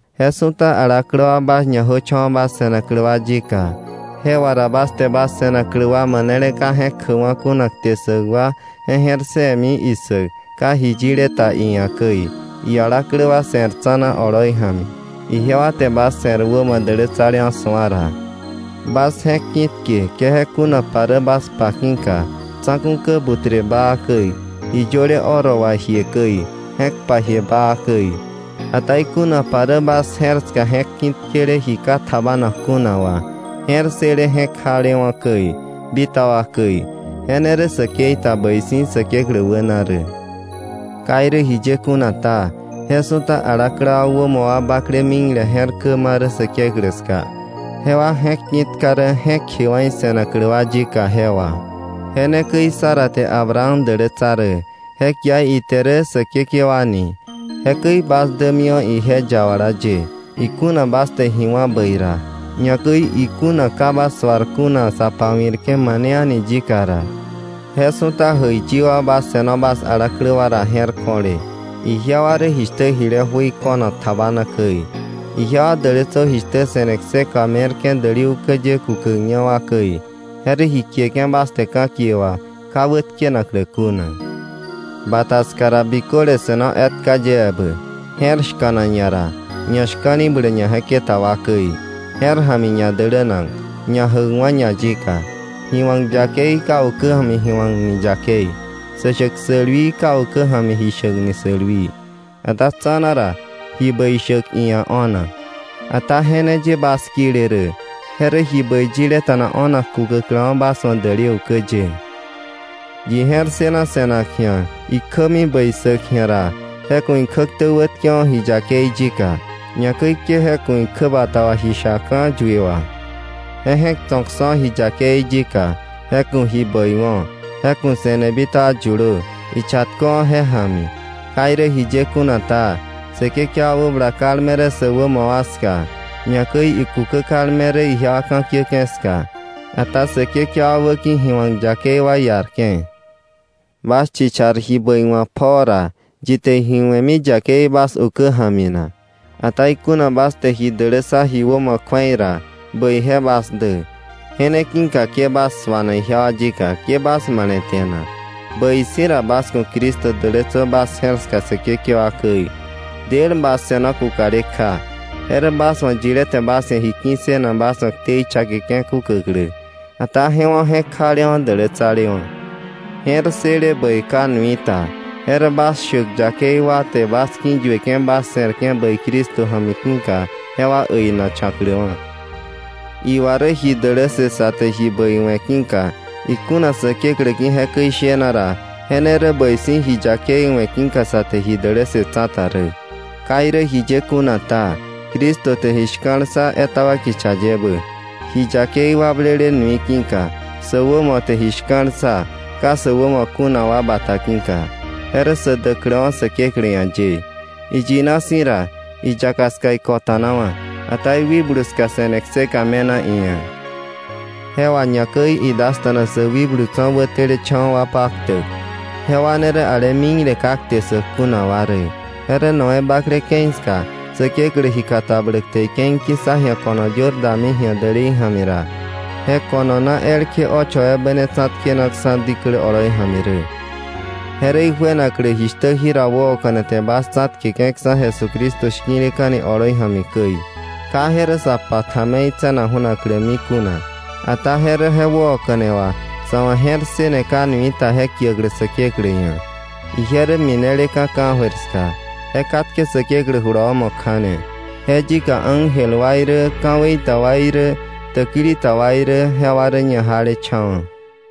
Je su̱ta alaklä wa bas ñajöcho̱wa̱ bas se̱naklä wa yika. Je wà ra bas te bas se̱naklä wa manele ka je̱k jäkwa̱ kuna kte ssäk wa, je je̱r ssëwe̱mi issäk, ka ji yile ta iia̱ käi, ialaklä wa se̱r tsa̱na oloi ja̱mi, ijewa te bas se̱r wämo, dälätsalewa̱ su̱a ra. Bas je̱k ki̱tke ke kunapa rä bas pa ki̱ka: tsa̱ku̱ kä butre baa käi, ji yöle oro wà jie käi, je̱k pajie baa käi; ata ikunapa rä bas je̱r ska je̱k ki̱tkele ji ka tjabanak kuna wà, je̱r ssële je̱k jalewa̱ käi, bitaba käi. Je ne rä säkei ta bäi si̱ Säkeklä wäna rä. Ka irä jiye kuna ta, je su̱ta alaklä wa wämo wa bakle mikle je̱r blele Säkeklä ja̱mi, jewa je̱k ki̱tka rä je̱k jewa̱ ise̱naklä wa yika je wà. Je ne käi Sara te Abraham dälätsa rä, je kia ite rä säkekewa ni. Jekäi bas dämiwa̱ ije yabala ye, ikuna bas te ji wá̱ bäi ra, ñakäi ikuna ka bas suar kuna sa pawi̱rke̱ mane a̱ni yika ra. Je su̱ta jäiyi wa bas se̱no bas alaklä wa ra je̱r ko̱le, ijewa rä jishtä jile jui ko̱nak tjabana käi, ijewa dälätsö jishtä se̱ne kseka me̱rke̱ däli ukä ye kukäkña wa käi, je rä ji kieke̱ bas te ka̱kie wà ka wätkenaklä kuna. Bata ska ra, biköle ssëno etka ye ebä, je̱r shka̱nak ñara, ñashka̱li̱bläk ñaje̱keta wa käi, je̱r ja̱mi ñadälänak, ñajäkwa̱ ñayika, ji wa̱k yakei, ka ukä ja̱mi ji wa̱kni yakei, sä shäk sälwii, ka ukä ja̱mi ji shäkni sälwii, ata tsa̱na ra, ji bäi shäk iia̱ o̱nak. Ata je ne ye bas kile rä, je rä ji bäi yileta̱na o̱nak kukäkläwa̱ bas wa̱ däli ukä ye. “Yi je̱r ssëna se̱nak ji̱a, ikjämi bäi ssäk ji̱a ra, je ku̱ ikjäktä wätkewo̱ ji yakei yika, ñakäi ke je ku̱ ikjäbata wà ji sha ka̱yue wà. Je je̱k tso̱ksa̱ ji yakei yika, je ku̱ ji bäi wo̱; je ku̱ se̱ne bitaba yulö, ichatköwa̱ je ja̱mi. Ka irä jiye kuna ta, Säkekewa wäbala kalme rä sä wämo wa ska, ñakäi ikukä kalme rä ijewa ka̱kiäke̱ ska, ata Säkekewa wäki̱ ji wa̱k yakei wa iarke̱.” Bas chichar ji bäi wa̱k pjoo ra ¿yi te ji we̱mi yakei bas ukä ja̱mi na? Ata ikuna bas te ji dälässa ji wämo kju̱ei ra, bäije bas dä, je ne ki̱ka ke bas su̱anak sualewa̱ ijewa yika, ke bas male̱te̱nak. Bäi si̱ ra, bas ku̱ Cristo dälätsö bas je̱r ska Säkekewa käi. Del bas se̱no kukale kja, je rä bas wa̱ yi te bas ia̱ ji ki̱ssënak bas wa̱ ktei chakeke̱ kúkäklä. Ata je wo̱ je̱k jalewa̱, dälätsalewa̱, je̱r ssële bäi ka nui ta, je rä bas shäk yakei wa te bas ki̱yueke̱ bas se̱rke̱ bäi Cristo ja̱mi ki̱ka, jewa äinacha̱kläwa̱. Iwa rä ji dälässë sä te ji bäi we̱ ki̱ka, ikuna Säkeklä ki̱ jekäi ishena ra, je ne rä bäi si̱ ji yakei we̱ ki̱ka sa te ji dälässë tsa̱ta rä. Ka irä jiye kuna ta, Cristo te ji shka̱l ssa etaba kicha yebä, ji yakei wakblele nui ki̱ka; sä wämo te ji shka̱l ssa, ka sä wämo kuna wa bata ki̱ka, je rä sä däkläwa̱ Säkeklä ia̱ ye. Iyina si̱ ra iyaka ska ikota̱nawa̱, ata iwikblu ska se̱ne kseka me̱na iia̱, je wà ñakäi idasta̱na sä wikblu tso̱ wätelecha̱wa̱ wa paktäk. Jewa ne rä ale mikle ka kte ssäk kuna wa rä, je rä Noé bakle ke̱i ska Säkeklä ji katabläk te ike̱i ki̱ssa ji̱a ko̱no yör dami ji̱a dälei ja̱mi ra. Je ko̱no na elkje ocho ebä ne tsa̱tkenaksa̱ diklä oloi ja̱mi rä. Je rä ijuenaklä jishtä jira wäoka̱ne te bas tsa̱tkeke̱ksa̱ Jesucristo shki̱leka̱ni oloi ja̱mi käi. Ka je rä sa pa tja̱me̱i tse̱na ju̱naklämi kuna, ata je rä je wäoka̱ne wà sa̱ wa̱ je̱r ssëne ka nui ta je kiäklä Säkeklä ia̱. Ije rä mineleka̱ ka̱jöir ska, je katke Säkeklä jula wämo kja̱ne. Je yika ángel wa irä, ka̱wei ta wa irä, täkili ta wa irä, jewa rä ñajalecha̱wa̱.